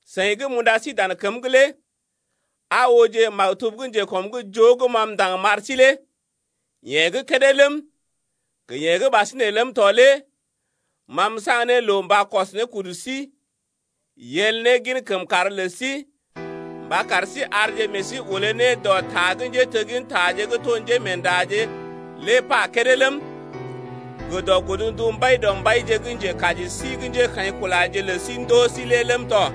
Seḭ gə́ m’unda sí dan kəm’g lé aa ooje maktub njekɔm’g joo gə́ ma m’ndaŋg m’ar sí lé. Yeḛ gə́ kédé ləm, gə yeḛ gə́ ɓasinè ləm tɔ lé ma m’saŋg ne loo mba kɔs kudu sí yel ne gin kəmkàr lə sí mba kar sí arje meḛ sí olé ne dɔ ta gə́ njéteggintaje gə́ to njémeendaje lé pa kédé ləm, gə dɔ godndu Mbaidɔmbaije gə́ Njekaji sí gə́ njékaḭkulaje lə sí ndoo sí lé ləm tɔ.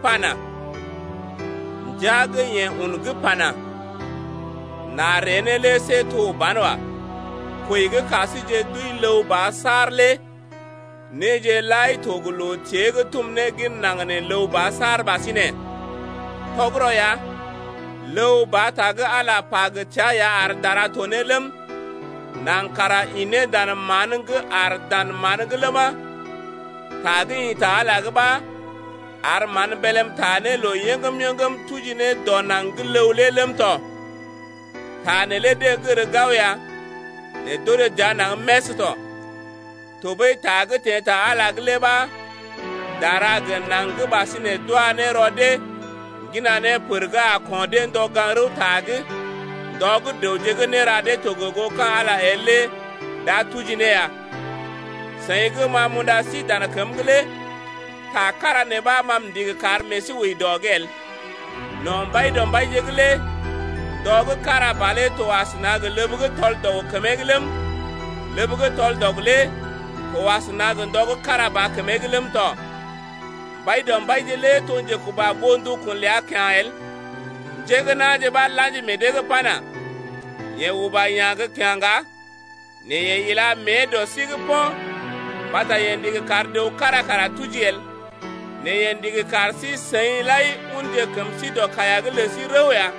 pana: Ndia gə́ yeḛ un gə́ pana: N’a ree ne lé see to banwa, kwəi gə́ ka síje d’wəi ləw ba saar lé néje lai to gə loo tée gə́ tum ne gin naŋg nee ləw ba saar ɓasinè. Tɔgərɔ ya, ləw ba ta gə́ Ala pa gə təa ya ar dara to ne ləm, naŋg kara ḭ ne dan mán’g gə aar dan mán’g ləma, ta gə́ ḭ ta Ala’g ɓa ar mán bélm taa ne loo yəŋgəm-yəŋgəm tuji ne dɔ naŋg gə́ ləw lé ləm tɔ. Ta neelé deḛ gər gao ya nɛ d’orè dəa naŋg mès tɔ. Tɔɓəi ta gə́ teḛ ta Ala’g lé ɓa dara gə naŋg gə́ ɓasinè lé d’wa ne rɔ deḛ ŋgina ne pər gə́ a ko̰ dee ndɔ gaŋg rəwta’g, ndɔ gə́ dəwje gə́ néra dee to gə goo ka̰ Ala el lé d’a tuji ne ya. Seḭ gə́ ma m’unda sí dan kəm’g lé ta kára nee ɓa ma m’ndigi kar meḛ sí wəi dɔ’g el: No̰ Mbaidɔmbaije’g lé ndɔ gə́ kára ba lé to asəna gə ləb gə́ tɔl-dɔg kəmee’g ləm, ləb gə́ tɔl-dɔg lé to asəna gə ndɔ gə́ kára ba kəmee’g ləm tɔ. Mbaidɔmbaije lé to njekuba goo ndukun ləa kyá̰ el. Njé gə́ na̰je ɓa la̰ji meḛ dee’g pana: Yeḛ uba yá̰ gə́ kyá̰ ŋga nɛ yeḛ ila mée dɔ sí’g po̰ mbata yeḛ ndigi kar dəw kára kara tuji el, nɛ yeḛ ndigi kar sí-seḭ lai unje kəm sí dɔ kaiya’g lə sí rəw ya.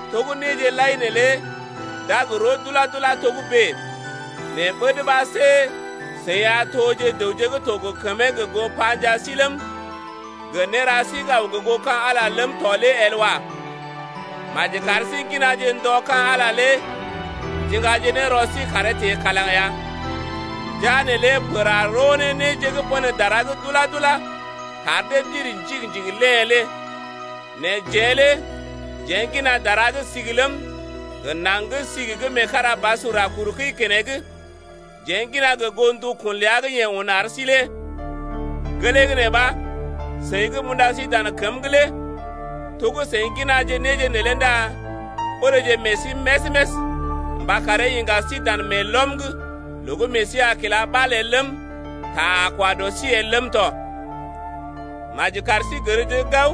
To gə́ néje lai neelé d’a gə roo dula-dula togə́bè nɛ ɓəd ɓa see seḭ a toje dəwje gə́ to gə kəmee gə goo panjaa sí ləm, gə néra sí gə́ aw gə goo ka̰ Ala ləm tɔ lé el wa. Maji kar sí ŋginaje ndɔ ka̰ Ala lé ndiŋgaje ne rɔ sí karee teḛ kalaŋ ya. Ndəa neelé pər a roo ne néje gə́ pən dara’g dula-dula kar dee ndiri njigi-njigi léḛ lé. Nɛ jeḛ lé jeḛ ŋgina dara gə́ sigi ləm, gə naŋg gə́ sigi gə́ meekarabasur a kur kəi keneŋ, jeḛ ŋgina gə goo ndukun ləa gə́ yeḛ un ar sí lé. Gelee gə́ nee ɓa, seḭ gə́ m’unda sí dan kəm’g lé to gə́ seḭ ŋginaje néje neelé ndá oreeje meḛ sí més-més mba karee iŋga sí dan meelɔm’g loo gə́ meḛ sí a kila ɓal el ləm, ta a kwa dɔ sí el ləm tɔ. Maji kar sí gərje gao,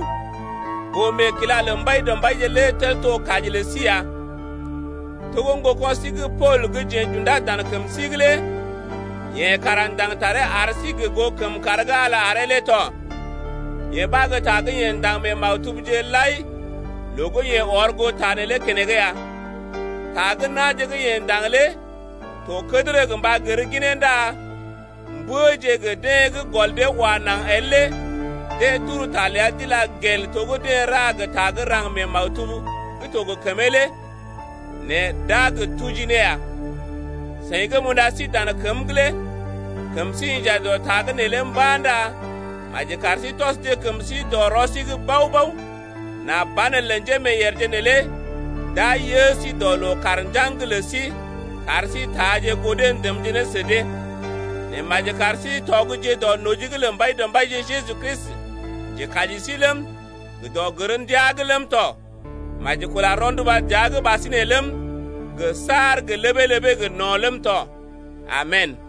boo-meekila lə Mbaidɔmbaije lé tel to kaji lə sí ya, to gə́ ŋgoko̰ sí gə́ Pool gə́ jeḛ j’undá dan kəm sí’g lé yeḛ kara ndaŋg taree ar sí gə goo kəmkàr gə́ Ala aree lé tɔ. Yee ɓa gə́ ta gə́ yeḛ ndaŋg mee maktubje lai loo gə́ yeḛ ɔr goo ta neelé keneŋ ya. Ta gə́ na̰je gə́ yeḛ ndaŋg lé to kədərə gə mba gər ginee ndá mbəje gə deḛ gə́ gɔl dee wa naŋg el lé deḛ turu ta ləa d’ila gel to gə́ deḛ ra gə ta gə́ raŋg gə́ mee maktub gə́ to gə kəmee lé nɛ d’a gə tuji ne ya. Seḭ gə́ m’unda sí dan kəm’g lé kəm sí inja dɔ ta’g neelé mba̰ ndá maji kar sí tɔsje kəm sí dɔ rɔ sí’g bao-bao nà banelə njémeeyèrje neelé d’a yə sí dɔ loo-kaar-njaŋg’g lə sí, kar sí taaje goo dee ndəmje ne sə dee. Nɛ maji kar sí tɔgje dɔ noji’g lə Mbaidɔmbaije Jeju Kristi, Njekaji sí ləm, gə dɔ gər ndiaa’g ləm tɔ. Maji kula rɔnduba dəa’g ɓasinè ləm gə saar gə́ ləbee-ləbee gə no̰ ləm tɔ. Amen!